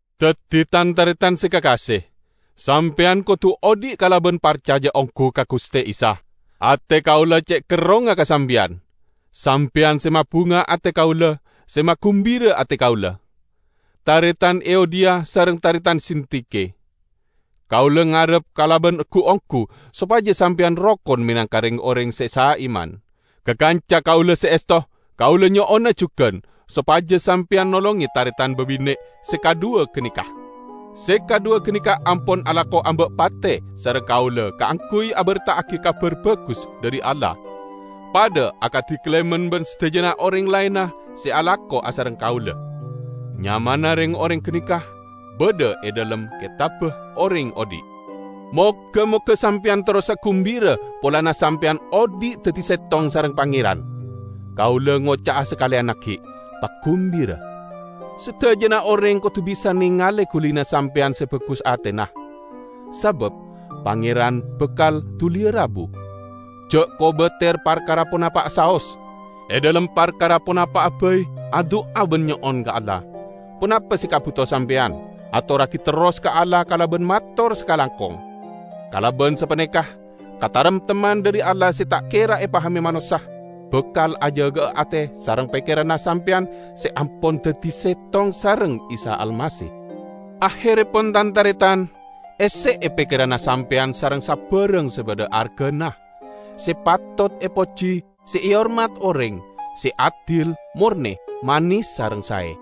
Daddi, tan-taretan se kakase, sampeyan kodu odhi' kalaban parcaja onggu ka Guste Isa. Ate kaula ce' kerrongnga ka sampeyan! Sampeyan se mabunga ate kaula, se magumbira ate kaula. Taretan Euodiya sareng taretan Sintike! Kaula ngarep kalaban gu-onggu sopaja sampeyan rokon menangka reng-oreng se saiman. Ka kanca kaula se esto, kaula nyo'ona jugan sopaja sampeyan nolonge taretan babine' se kadhuwa ganeka. Se kadhuwa ganeka ampon alako amba' pate sareng kaula kaangguy aberta'agi Kabar Bagus dhari Allah; padha akadi Klemen ban sadajana oreng laenna se alako asareng kaula. Nyamana reng-oreng ganeka badha e dhalem Ketabba Oreng Odhi'. Moga-moga sampeyan terrosa gumbira polana sampeyan odhi' daddi settong sareng Pangeran. Kaula ngoca'a sakaleyan aggi': pagumbira! Sadajana oreng kodu bisa nengale gulina sampeyan se bagus atena. Sabab Pangeran bakal duliya rabu. Ja' kobater parkara ponapa'a saos. E dhalem parkara ponapa'a bai adu'a ban nyo'on ka Allah. Ponapa se ekabuto sampeyan, atorragi terros ka Allah kalaban mator sakalangkong. Kalaban sapaneka, kataremtemman dhari Allah se ta' kera epahame manossa, bakal ajaga'a ate sareng pekkeranna sampeyan se ampon daddi settong sareng Isa Almasih. Aherrepon, tan-taretan, esse'e pekkeranna sampeyan sareng sabarang se badha argana, se patot epoji, se ehormat oreng, se adil, morne, manes sareng sae.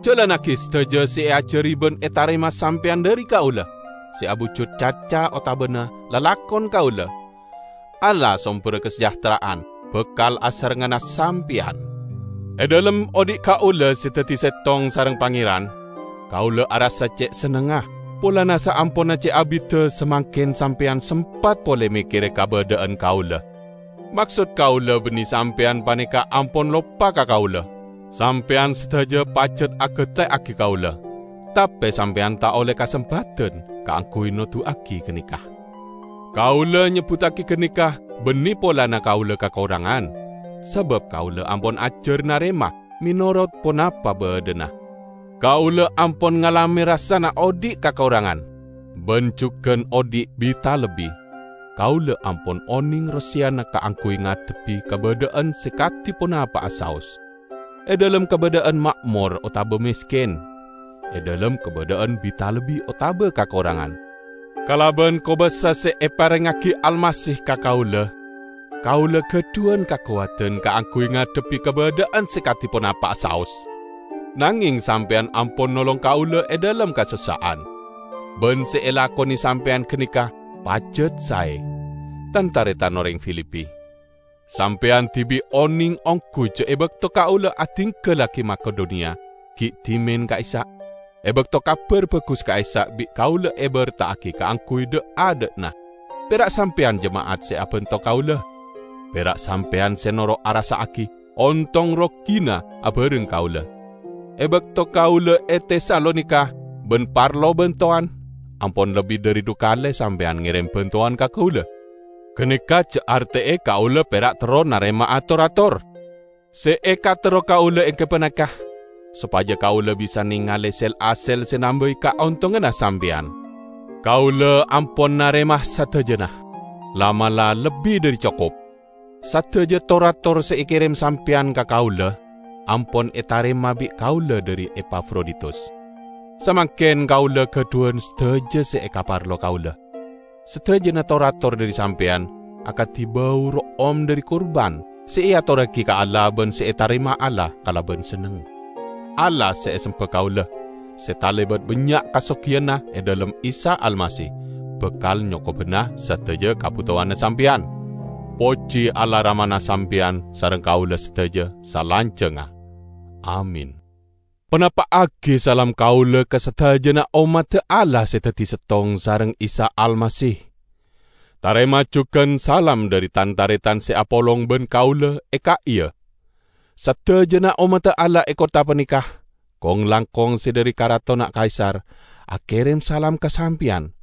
Jalannagi sadaja se eajari ban etarema sampeyan dhari kaula; se abujud caca otabana lalakon kaula. Allah somberra kasajahtera'an, bakal asarengnganna sampeyan. E dhalem odhi' kaula se daddi settong sareng Pangeran, kaula arassa ce' sennengnga polana saamponna ce' abidda, samangken sampeyan sempat pole mekkere kabadha'an kaula. Maksod kaula banne sampeyan paneka ampon loppa ka kaula; sampeyan sadaja pajat agateyagi kaula, tape sampeyan ta' olle kasempadan kaangguy noduwagi ganeka. Kaula nyebbuttagi ganeka banne polana kaula kakorangan, sabab kaula ampon ajar narema menorot ponapa badhana. Kaula ampon ngalame rassana odhi' kakorangan, ban jugan odhi' bi-talebbi. Kaula ampon oneng roseyana kaangguy ngadhebbi kabadha'an se kadi ponapa'a saos; e dhalem kabadha'an ma'mor otaba mesken, e dhalem kabadha'an bi-talebbi otaba kakorangan. Kalaban kobasa se eparengngagi Almasih ka kaula, kaula gadhuwan kakowadan kaangguy ngadhebbi kabadha'an se kadi ponapa'a saos. Nangeng sampeyan ampon nolong kaula e dhalem kasossa'an; ban se elakone sampeyan ganeka pajat sae. Tan-taretan oreng Filipi! Sampeyan dibi' oneng onggu ja' e bakto kaula adinggallagi Makedoniya gi' dhimen ka'issa', e bakto Kabar Bagus ka'issa' bi' kaula eberta'agi kaangguy dha'-adha'na, pera' sampeyan jema'at se abanto kaula; pera' sampeyan se noro' arassa'agi ontong rogina abareng kaula. E bakto kaula e Tesalonika ban parlo bantowan, ampon lebbi dhari dhu kale sampeyan ngerem bantowan ka kaula. Ganeka ja' arte'e kaula pera' terro narema'a tor-ator. Se ekaterro kaula enggi paneka sopaja kaula bisa nengale sel-hasel se nambai kaontonganna sampeyan. Kaula ampon narema sadajana -- la'-mala' lebbi dhari cokop! Sadaja tor-ator se ekerem sampeyan ka kaula, ampon etarema bi' kaula dhari Epafroditus. Samangken kaula gadhuwan sadaja se ekaparlo kaula. Sadajana tor-ator dhari sampeyan akadi bau ro'om dhari kurban se eatorragi ka Allah ban se etarema Allah kalaban senneng. Allah se esemba kaula, se talebat bannya' kasogiyanna e dhalem Isa Almasih, bakal nyokobana sadaja kabutowanna sampeyan. Poji Allah Ramana sampeyan sareng kaula sadaja salanjangnga. Amin! Panapa'agi salam kaula ka sadajana ommadda Allah se daddi settong sareng Isa Almasih. Tarema jugan salam dhari tan-taretan se apolong ban kaula e ka'iya. Sadajana ommadda Allah e kottha paneka, kong-langkong se dhari karatonna Kaisar, akerem salam ka sampeyan.